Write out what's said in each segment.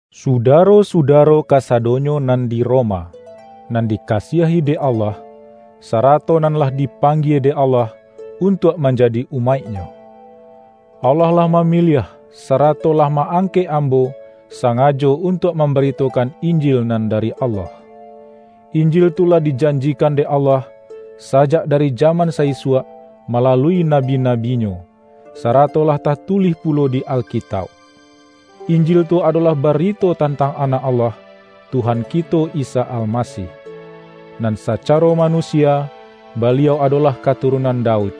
Sudaro-sudaro kasadonyo nan di Roma, nan dikasiahi dek Allah, sarato nan lah dipanggie dek Allah untuak manjadi umaik-Nyo. Allah lah mamiliah, sarato lah ma-angkek ambo sangajo untuak mambaritokan Injil nan dari Allah. Injil tu lah dijanjikan dek Allah, sajak dari jaman sa-isuak malalui nabi-nabi-Nyo, sarato lah tatulih pulo di Alkitauk. Injil tu adolah barito tantang Anak Allah, Tuhan kito Isa Almasih. Nan sacaro manusia, Baliau adolah katurunan Daud,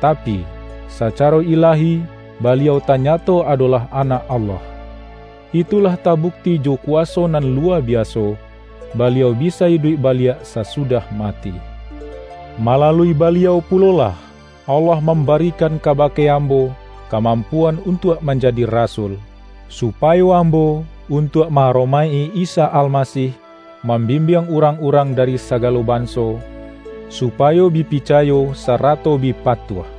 tapi, sacaro ilahi Baliau tanyato adolah Anak Allah. Itu lah tabukti jo kuwaso nan luwa biaso, Baliau bisa iduik baliak sasudah mati. Malalui Baliau pulolah, Allah mambarikan kabake ambo kamampuan untuak manjadi rasul, supayo ambo — untuak ma-aromaik-i Isa Almasih — mambimbiang urang-urang dari sagalo banso, supayo bi picayo sarato bi patuah.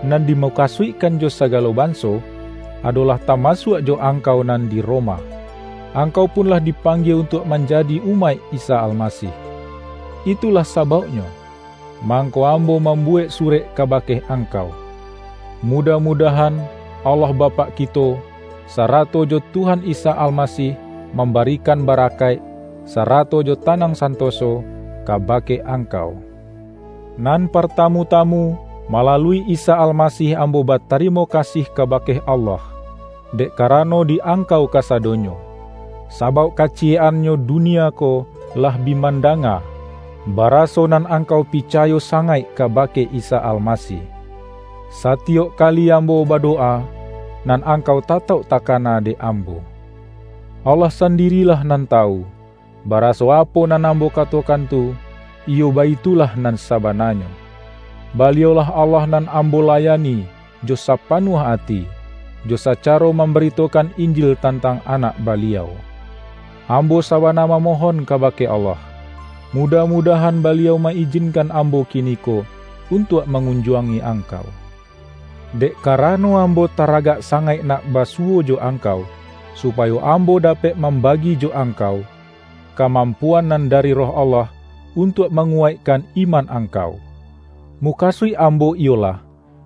Nan dimukasuikkan jo sagalo banso, adolah tamasuak jo angkau nan di Roma; angkau pun lah dipanggie untuak manjadi umaik Isa Almasih. Itulah sabauknyo, mangko ambo mambuwek surek kabake angkau. Mudah-mudahan Allah Bapak kito, sarato jo Tuhan Isa Almasih mambarikan barakaik, sarato jo tanang santoso kabake angkau. Nan partamu-tamu, malalui Isa Almasih ambo batarimo kasih kabake Allah, dek karano di angkau kasadonyo; sabauk kaciyek-annyo dunia ko lah bi mandanga, baraso nan angkau picayo sangaik kabake Isa Almasih. Satiyok kali ambo badowa, nan angkau tatauk takana dek ambo. Allah sandirilah nan tawu, baraso apo nan ambo katokan tu, iyo baitulah nan sabananyo. Baliau-lah Allah nan ambo layani jo sapanuah ati, jo sacaro mambaritokan lnjil tantang Anak Baliau. Ambo sabana mamohon kabake Allah, mudah-mudahan Baliau ma-ijinkan ambo kiniko, untuak mangunjuangi angkau. Dek karano ambo taragak sangaik nak basuwo jo angkau, supayo ambo dapek mambagi jo angkau, kamampuan nan dari Roh Allah, untuak manguwaikkan iman angkau. Mukasuik ambo iyolah,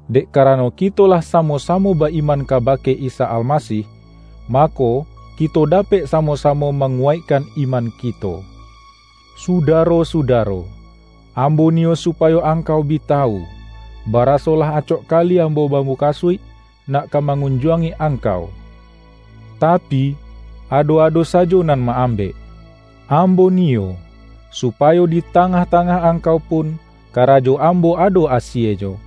dek karano kito lah samo-samo ba-iman kabake Isa Almasih, mako, kito dapek samo-samo manguwaikkan iman kito. Sudaro-sudaro! Ambo niyo supayo angkau bi tawu, baraso lah acok kali ambo bamukasuik nak ka mangunjuangi angkau, tapi, ado-ado sajo nan ma-ambek. Ambo niyo, supayo di tangah-tangah angkau pun karajo ambo ado asienyo,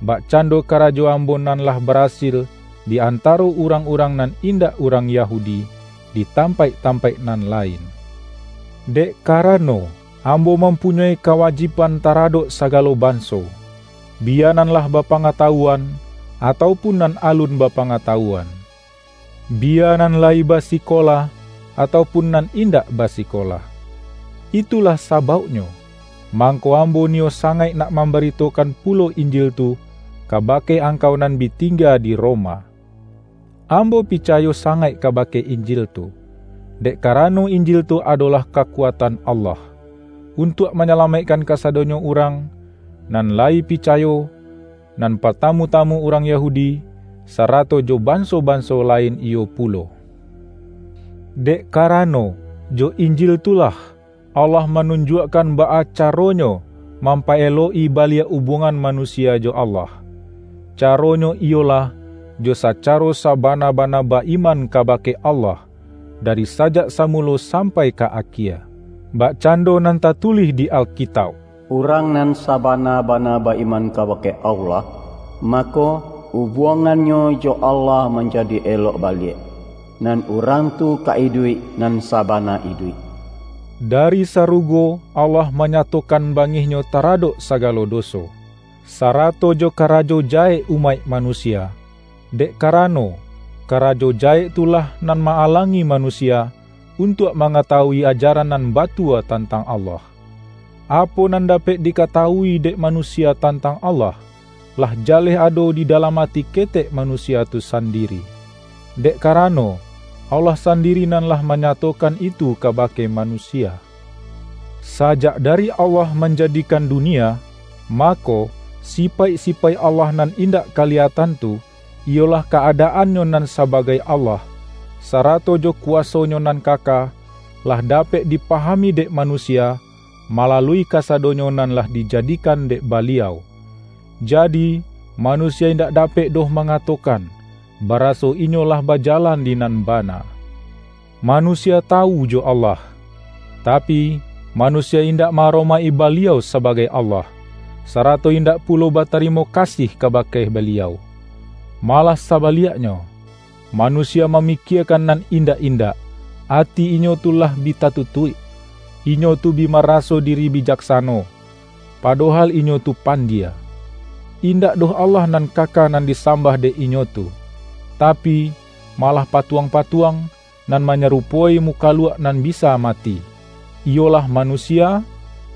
bakcando karajo ambo nan lah barasil di antaro urang-urang nan indak urang Yahudi, di tampaik-tampaik nan lain. Dek karano, ambo mampunyoi kawajiban taradok sagalo banso: biya nan lah bapangatawuan, atau pun nan alun bapangatawuan, biya nan layi basikola, atau pun nan indak basikola. Itulah sabauknyo, mangko ambo niyo sangaik nak mambaritokan pulo Injil tu, kabake angkau nan bi tingga di Roma. Ambo picayo sangaik kabake Injil tu, dek karano Injil tu adolah kakuatan Allah, untuak manyalamaikkan kasadonyo urang nan layi picayo; nan partamu-tamu urang Yahudi, sarato jo banso-banso lain iyo pulo. Dek karano, jo Injil tu lah, Allah manunjuakkan baa caronyo, mampaelok-i baliak ubuangan manusia jo Allah; caronyo iyolah, jo sacaro sabana-bana ba-iman kabake Allah, dari sajak samulo sampai ka akie. Bakcando nan tatulih di Alkitauk,”Urang nan sabana-bana ba-iman kabake Allah, mako, ubuangannyo jo Allah manjadi elok baliak, nan urang tu ka iduik, nan sabana iduik!” Dari sarugo Allah manyatokan bangih-Nyo taradok sagalo doso, sarato jo karajo jahek umaik manusia, dek karano, karajo jahek tu lah nan ma-alangi manusia, untuak mangatawui ajaran nan batua tantang Allah. Apo nan dapek dikatawui dek manusia tantang Allah, lah jaleh ado di dalam ati ketek manusia tu sandiri, dek karano, Allah sandiri nan lah manyatokan itu kabake manusia. Sajak dari Allah manjadikan dunia, mako, sipaik-sipaik Allah nan indak kaliyatan tu, iyolah ka-adaan-Nyo nan sabagai Allah, sarato jo kuwaso-Nyo nan kaka, lah dapek dipahami dek manusia, malalui kasadonyo nan lah dijadikan dek Baliau. Jadi, manusia indak dapek doh mangatokan, baraso inyo lah bajalan di nan bana. Manusia tawu jo Allah, tapi, manusia indak ma-aromaik-i Baliau sabagai Allah, sarato indak pulo batarimo kasih kabake Baliau. Malah sabaliaknyo, manusia mamikiekan nan indak-indak; ati inyo tu lah bi tatutuik. Inyo tu bi maraso diri bijaksano, padohal inyo tu pandie. Indak doh Allah nan kaka nan disambah dek inyo tu, tapi, malah patuang-patuang, nan manyarupoi mukaluak nan bisa mati; iyolah manusia,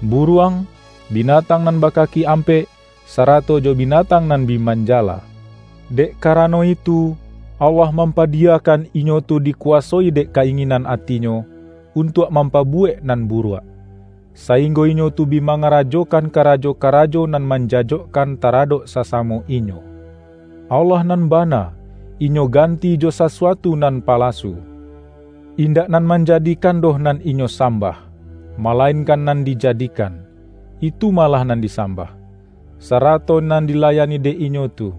buruang, binatang nan bakaki ampek, sarato jo binatang nan bi manjala. Dek karano itu, Allah mampadiyakan inyo tu dikuwasoi dek ka-inginan atinyo, untuak mampabuwek nan buruak, sainggo inyo tu bi mangarajokan karajo-karajo nan manjajokkan taradok sasamo inyo. Allah nan bana, inyo ganti jo sasuatu nan palasu. Indak Nan Manjadikan doh nan inyo sambah, malainkan nan dijadikan, itu malah nan disambah, sarato nan dilayani dek inyo tu.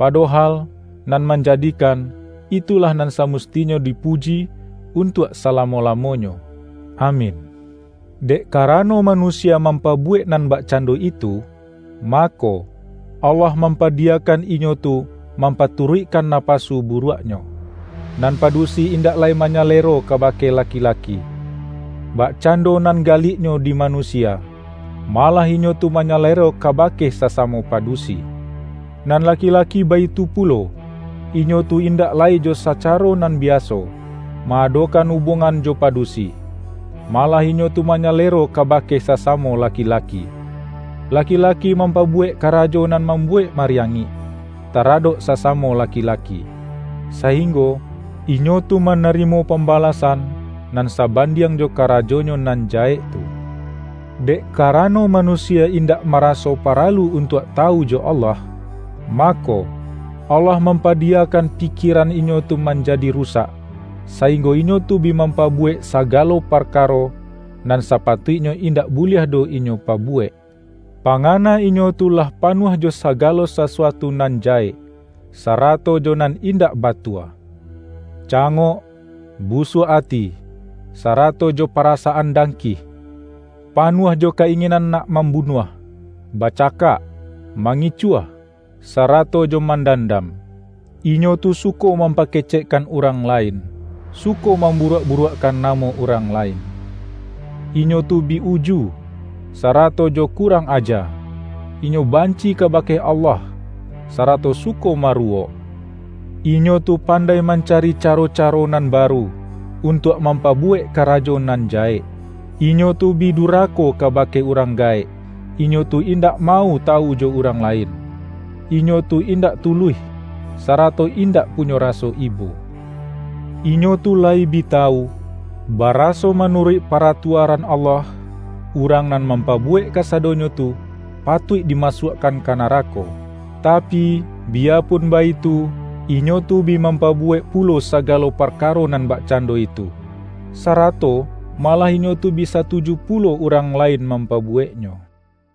Padohal, Nan Manjadikan, itulah nan samustinyo dipuji untuak salamo-lamonyo! Amin! Dek karano manusia mampabuwek nan bakcando itu, mako, Allah mampadiyakan inyo tu mampaturuikkan napasu buruaknyo. Nan padusi indak lai manyalero kabake laki-laki, bakcando nan galiknyo di manusia, malah inyo tu manyalero kabake sasamo padusi. Nan laki-laki baitu pulo; inyo tu indak lai jo sacaro nan biaso, ma-adokan ubuangan jo padusi, malah inyo tu manyalero kabake sasamo laki-laki. Laki-laki mampabuwek karajo nan mambuwek mariangik, taradok sasamo laki-laki, sainggo inyo tu manarimo pambalasan, nan sabandiang jo karajonyo nan jahek tu. Dek karano manusia indak maraso paralu untuak tawu jo Allah, mako, Allah mampadiyakan pikieran inyo tu manjadi rusak, sainggo inyo tu bi mampabuwek sagalo parkaro, nan sapatuiknyo indak buliah doh inyo pabuwek. Pangana inyo tu lah panuah jo sagalo sasuatu nan jahek, sarato jo nan indak batua; cangok, busuak ati, sarato jo parasaan dangkih; panuah jo ka-inginan nak mambunuah, bacakak, mangicuah, sarato jo mandandam. Inyo tu suko mampakecekkan urang lain, suko mamburuak-buruakkan namo urang lain; inyo tu bi uju, sarato jo kurang aja, inyo banci kabake Allah, sarato suko maruwok. Inyo tu pandai mancari caro-caro nan baru, untuak mampabuwek karajo nan jahek. Inyo tu bi durako kabake urang gaek; inyo tu indak mau tawu jo urang lain; inyo tu indak tuluih, sarato indak punyo raso ibo. Inyo tu layi bi tawu, baraso manuruik paratuaran Allah, urang nan mampabuwek kasadonyo tu, patuik dimasuakkan ka narako. Tapi, biyapun baitu, inyo tu bi mampabuwek pulo sagalo parkaro nan bakcando itu; sarato malah inyo tu bi satuju pulo urang lain mampabuweknyo. ROMA